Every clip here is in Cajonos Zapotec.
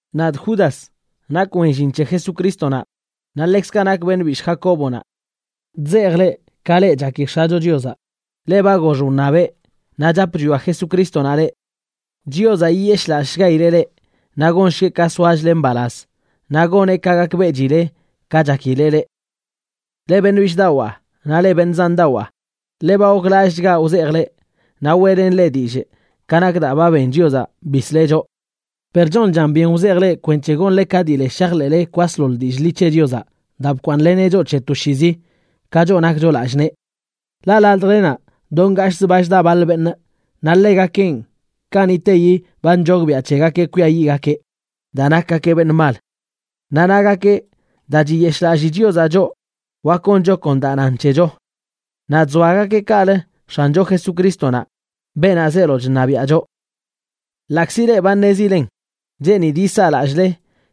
Nadꞌ Judas, nakꞌ wen llin c̱he Jesucrístonaꞌ naꞌ ḻekzkaꞌ nakꞌ beṉꞌ bishꞌ Jacóbonaꞌ. Chzejꞌ leꞌ, ka leꞌ chaki X̱acho Chiozaꞌ, leꞌ ba gox wṉabeꞌ, naꞌ chap chwia Jesucrístonaꞌ leꞌ. Chiozaꞌ yiyeshꞌlallꞌshgaileꞌ leꞌ, naꞌ gonshgueꞌ ka soachle mbalaz naꞌ goneꞌ ka gakbeꞌchileꞌ ka chakileꞌ leꞌ. Leꞌ beṉꞌ bishꞌdawaa naꞌ leꞌ beṉꞌ zandawaa, ḻe ba goklallꞌchgaꞌ wzejꞌ leꞌ naꞌ weꞌlenꞌ leꞌ dillꞌ ka nak daa ba ben Chiozaꞌ bisleꞌ choꞌ. Per chonchan byen wzejꞌ leꞌ kwenc̱he gonle ka dii le shajḻeꞌle kwasḻoḻ dillꞌ ḻi c̱he Chiozaꞌ daa bkwaaṉleneꞌ choꞌ c̱he toshiizi, ka choꞌ nakcho lallꞌ nee. Ḻaꞌ ladjlenaꞌ do ngashꞌzə ba chda baḻ beṉꞌ, naꞌ ḻegakenꞌ, kaniꞌteyi ba nchogbiaꞌ c̱hegakeꞌ kwiayiꞌgakeꞌ daa nakgakeꞌ beṉꞌ mal. Naꞌ nagakeꞌ daa chiyeshꞌlalli Chiozaꞌ choꞌ wak goncho kon daa nan c̱hecho. Naꞌ chzoagakeꞌ kaꞌlə X̱ancho Jesucrístonaꞌ, beenaꞌ zeelo chṉabiaꞌ choꞌ. Ḻaꞌkzi leꞌ ba ṉezilen, cheenidꞌ yisaa lallꞌle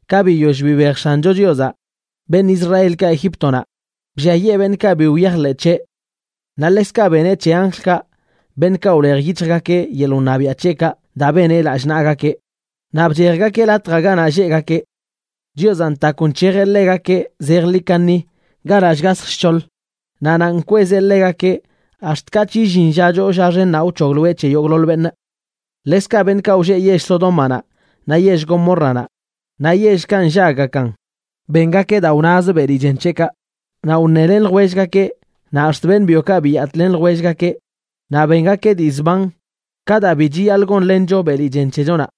ka biyoll bibej X̱ancho Chiozaꞌ beṉꞌ Israelkaꞌ Egíptonaꞌ, blliayee beṉꞌkaꞌ bi wyajḻeꞌ c̱heꞌ. Naꞌ ḻekzkaꞌ beneꞌ c̱he anjlkaꞌ, beṉꞌkaꞌ wlej yic̱hjgakeꞌ yeḻꞌ wṉabiaꞌ c̱heꞌkaꞌ daa beneꞌ lallꞌ nagakeꞌ, naꞌ bchejgakeꞌ latj ganaꞌ lleꞌgakeꞌ. Chiozaꞌ ntakw nc̱hejeꞌ ḻegakeꞌ zejḻi kaṉi ganaꞌ shgasj shc̱hoḻ, naꞌ nanꞌ nkwezeꞌ ḻegakeꞌ ax̱t katꞌ illin lla choo lla xennaꞌ wc̱hogloeꞌ c̱he yogꞌḻoḻ beṉꞌ. Ḻekzkaꞌ beṉꞌkaꞌ wlleꞌ yell Sodómanaꞌ naꞌ yell Gomórranaꞌ, naꞌ yellkaꞌ nllaggakan, bengakeꞌ daa wnaz beli chen c̱heꞌkaꞌ, naꞌ wṉelen ljwellgakeꞌ, naꞌ ax̱t beṉꞌ byokaꞌ biyatꞌlen ljwellgakeꞌ naꞌ bengakeꞌ dii zban ka daa bi chiyaḻꞌ gonlencho beli chen c̱hechonaꞌ.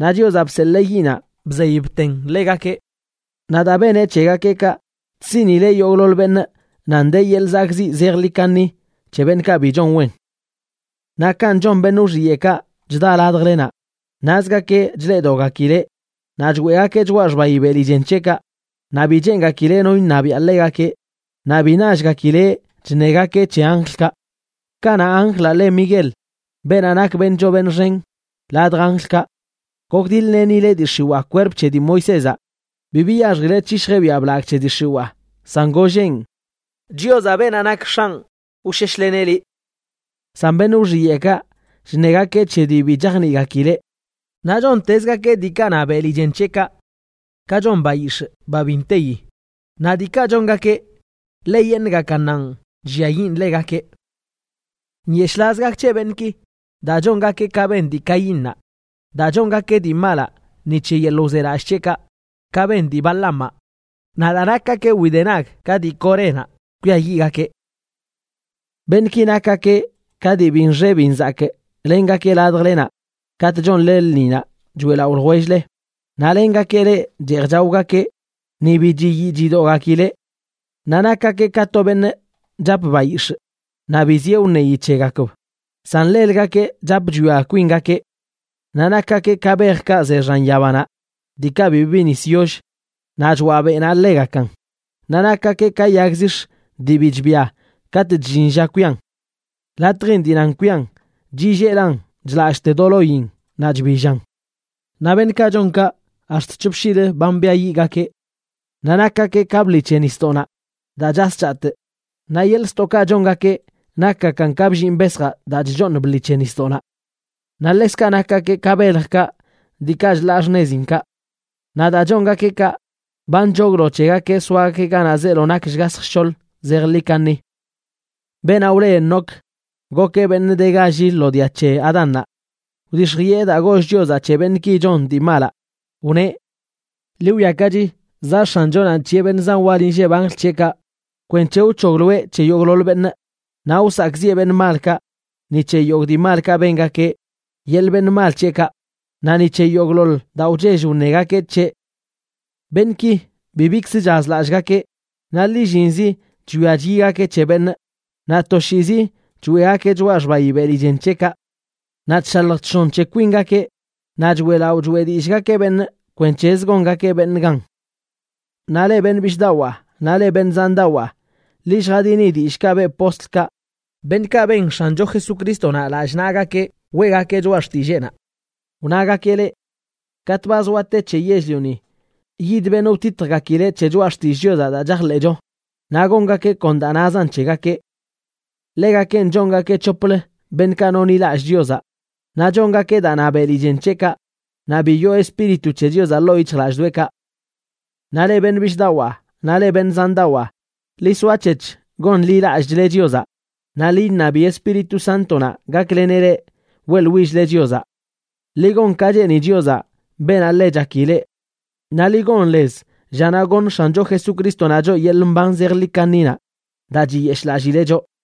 Naꞌ Chiozaꞌ bseḻee yiꞌnaꞌ bzey bten ḻegakeꞌ. Naꞌ daa beneꞌ c̱hegakeꞌ kaꞌ, chsiꞌnileꞌ yogꞌḻoḻ beṉꞌ nan de yeḻꞌ zakꞌziꞌ zejḻi kaṉi c̱he beṉꞌkaꞌ bi chon wen. Naꞌ kanꞌ chon beṉꞌ wxiyeꞌkaꞌ chda ladjlenaꞌ, nazgakeꞌ chleꞌdoꞌgakileꞌ, naꞌ choeꞌgakeꞌ choꞌa xbayi beli chen c̱heꞌkaꞌ, naꞌ bi cheengakileꞌ no iṉabiaꞌ ḻegakeꞌ naꞌ bi nallgakileꞌ chṉegakeꞌ c̱he anjlkaꞌ. Kanaꞌ anjlaꞌ le Miguel, beenaꞌ nak beṉꞌ choo beṉꞌ xen ladj anjlkaꞌ, gokdiḻ-lenileꞌ dii x̱iwaa kwerp c̱he dii Moisézaꞌ, bi biyaxjileꞌ c̱hishjeꞌ biaꞌ blagꞌ c̱he dii x̱iwaa, san golleꞌn: “Chiozaꞌ, beenaꞌ nak X̱anꞌ, wsheshleneꞌ liꞌ.” San beṉꞌ wxiyeꞌkaꞌ, chṉegakeꞌ c̱he dii bi chajniꞌgakileꞌ. Naꞌ chontezgakeꞌ diikaꞌ na beli chen c̱heꞌkaꞌ, ka chon bayix̱ꞌ ba bi nteyi. Naꞌ diikaꞌ chongakeꞌ, ḻeyeṉꞌgakannanꞌ chlliayiꞌn ḻegakeꞌ. ¡Nyeshꞌlaz gak c̱he beṉꞌki!, daa chongakeꞌ ka ben dii Caínnaꞌ, naꞌ daa chongakeꞌ dii malaꞌ ni c̱he yeḻꞌ wzelallꞌ c̱heꞌkaꞌ, ka ben dii Balaamaꞌ. Naꞌ daa nakgakeꞌ widenag ka dii Corénaꞌ, kwiayiꞌgakeꞌ. Beṉꞌki nakgakeꞌ ka dii bi nxe bi nzakꞌ lengakeꞌ ladjlenaꞌ katꞌ chonle lṉinaꞌ choeꞌlaꞌo ljwell-le, naꞌ lengakeꞌ leꞌ cheej chaogakeꞌ ni bi chiyii chidoꞌgakileꞌ. Naꞌ nakgakeꞌ ka to beṉꞌ chap bayix̱ꞌ naꞌ bi zieꞌ wṉeyi c̱hegakb, san ḻelgakeꞌ chap chwia kwingakeꞌ. Naꞌ nakgakeꞌ ka bejkaꞌ ze xan yabanaꞌ diikaꞌ bibi nis yollə naꞌ choaꞌ beꞌnaꞌ ḻegakan. Naꞌ nakgakeꞌ ka yag zix̱ dii bi chbia katꞌ chllin lla kwian. Latjin dii nan kwian, chilleelan chḻallꞌte do loyin naꞌ chbillan. Naꞌ beṉꞌkaꞌ chon kaꞌ ax̱t c̱hop shiilə ba mbiayiꞌgakeꞌ. Naꞌ nakgakeꞌ ka bḻi c̱he nisdoꞌnaꞌ daa chas chatꞌ, naꞌ yeḻꞌ ztoꞌkaꞌ chongakeꞌ nakgakan ka bllinꞌ besjaꞌ daa chchooṉ bḻi c̱he nisdoꞌnaꞌ. Naꞌ ḻekzkaꞌ nakgakeꞌ ka beljkaꞌ diikaꞌ chlaa xṉezinkaꞌ. Naꞌ daa chongakeꞌ kaꞌ ba nchoglo c̱hegakeꞌ soaga keꞌ ganaꞌ zeelo nak shgasj shc̱hoḻ zejḻi kaṉi. Beenaꞌ wle Enoc, gokeꞌ beṉꞌ de galli lo dia c̱he Adánnaꞌ. Wdix̱jiꞌe daa goll Chiozaꞌ c̱he beṉꞌki chon dii malaꞌ, wneꞌ: “Ḻi wwiakachi, zaꞌ X̱anchonaꞌ nc̱hiꞌe beṉꞌ zan wal inlleb anjl c̱heꞌkaꞌ kwenc̱he wc̱hogloeꞌ c̱he yogꞌḻoḻ beṉꞌ, naꞌ wsakꞌziꞌe beṉꞌ malkaꞌ ni c̱he yogꞌ dii malkaꞌ bengakeꞌ yeḻꞌ beṉꞌ mal c̱heꞌkaꞌ, naꞌ ni c̱he yogꞌḻoḻ daa wchell wṉegakeꞌ c̱heꞌ.” Beṉꞌki bibikzə chazlallꞌgakeꞌ, naꞌ lillinzi chwia chyigakeꞌ c̱he beṉꞌ, naꞌ toshiizi choeꞌgakeꞌ choꞌa xbayi beli chen c̱heꞌkaꞌ. Naꞌ chshalj chshon c̱he kwingakeꞌ, naꞌ choeꞌlaꞌo choeꞌ dillꞌgakeꞌ beṉꞌ kwenc̱hezə gongakeꞌ beṉꞌ gan. Naꞌ leꞌ beṉꞌ bishꞌdawaa naꞌ leꞌ beṉꞌ zandawaa, ḻi lljadini dillꞌkaꞌ beꞌ postlkaꞌ, beṉꞌkaꞌ ben X̱ancho Jesucrístonaꞌ lallꞌ naꞌgakeꞌ weꞌgakeꞌ choꞌa xtilleenaꞌ. Wnagakeꞌ leꞌ, “Katꞌ ba zoa te c̱he yell-lioni, yid beṉꞌ wtitjgakileꞌ c̱he choꞌa xtillꞌ Chiozaꞌ daa chajḻeꞌcho, naꞌ gongakeꞌ kon daa nazan c̱hegakeꞌ.” Ḻegakenꞌ chongakeꞌ c̱hoplə beṉꞌkaꞌ nonḻilallꞌ Chiozaꞌ, naꞌ chongakeꞌ daa na beli chen c̱heꞌkaꞌ naꞌ bi yoo Espíritu c̱he Chiozaꞌ ḻoo yic̱hjlallꞌdoꞌekaꞌ. Naꞌ leꞌ beṉꞌ bishꞌdawaa naꞌ leꞌ beṉꞌ zandawaa, ḻi soac̱hec̱h gonḻilallꞌchle Chiozaꞌ, naꞌ ḻi iṉabi Espíritu Sántonaꞌ gakleneꞌ leꞌ weꞌḻwill-le Chiozaꞌ. Ḻi gon ka cheeni Chiozaꞌ, beenaꞌ ḻe chaki leꞌ, naꞌ ḻi gon lez llanaꞌ goṉ X̱ancho Jesucrístonaꞌ choꞌ yeḻꞌ mban zejḻi kaṉinaꞌ daa chiyeshꞌlallileꞌ choꞌ.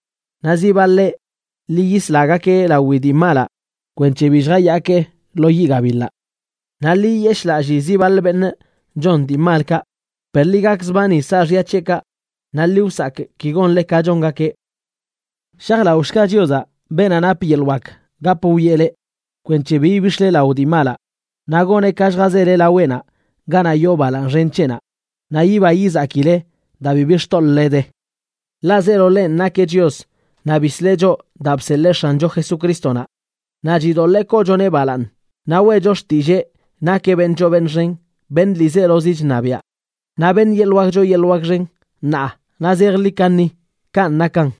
Naꞌ zi baḻeꞌ, ḻi yislagakeꞌ lawi dii malaꞌ kwenc̱he bi lljayaakeꞌ lo yiꞌ gabiḻaꞌ. Naꞌ ḻi yiyeshlallii zi baḻ beṉꞌ chon dii malkaꞌ, per ḻi gakzbani saaxya c̱heꞌkaꞌ naꞌ ḻi wsakꞌ ki gonle ka chongakeꞌ. Shajlaꞌoshga Chiozaꞌ, beenaꞌ nap yeḻꞌ wak gap wwieꞌ leꞌ kwenc̱he bi ibix̱le lao dii malaꞌ, naꞌ goneꞌ ka lljazele laweꞌnaꞌ ganaꞌ yoo balaaṉ xen c̱heꞌnaꞌ naꞌ yiba yizakile daa bibi xtoḻꞌle de. Ḻaꞌ zeelo ḻenꞌ nakeꞌ Chios, naꞌ bisleꞌ choꞌ daa bseḻee X̱ancho Jesucrístonaꞌ, naꞌ chidoḻee koochoneꞌ balaaṉ naꞌ weꞌcho xtillee nakeꞌ beṉꞌ choo beṉꞌ xen, beṉꞌ ḻiizelozi chṉabiaꞌ, naꞌ beṉꞌ yeḻꞌ wak choo yeḻꞌ wak xen, ṉaa naꞌ zejḻi kaṉi. Kanꞌ nakan.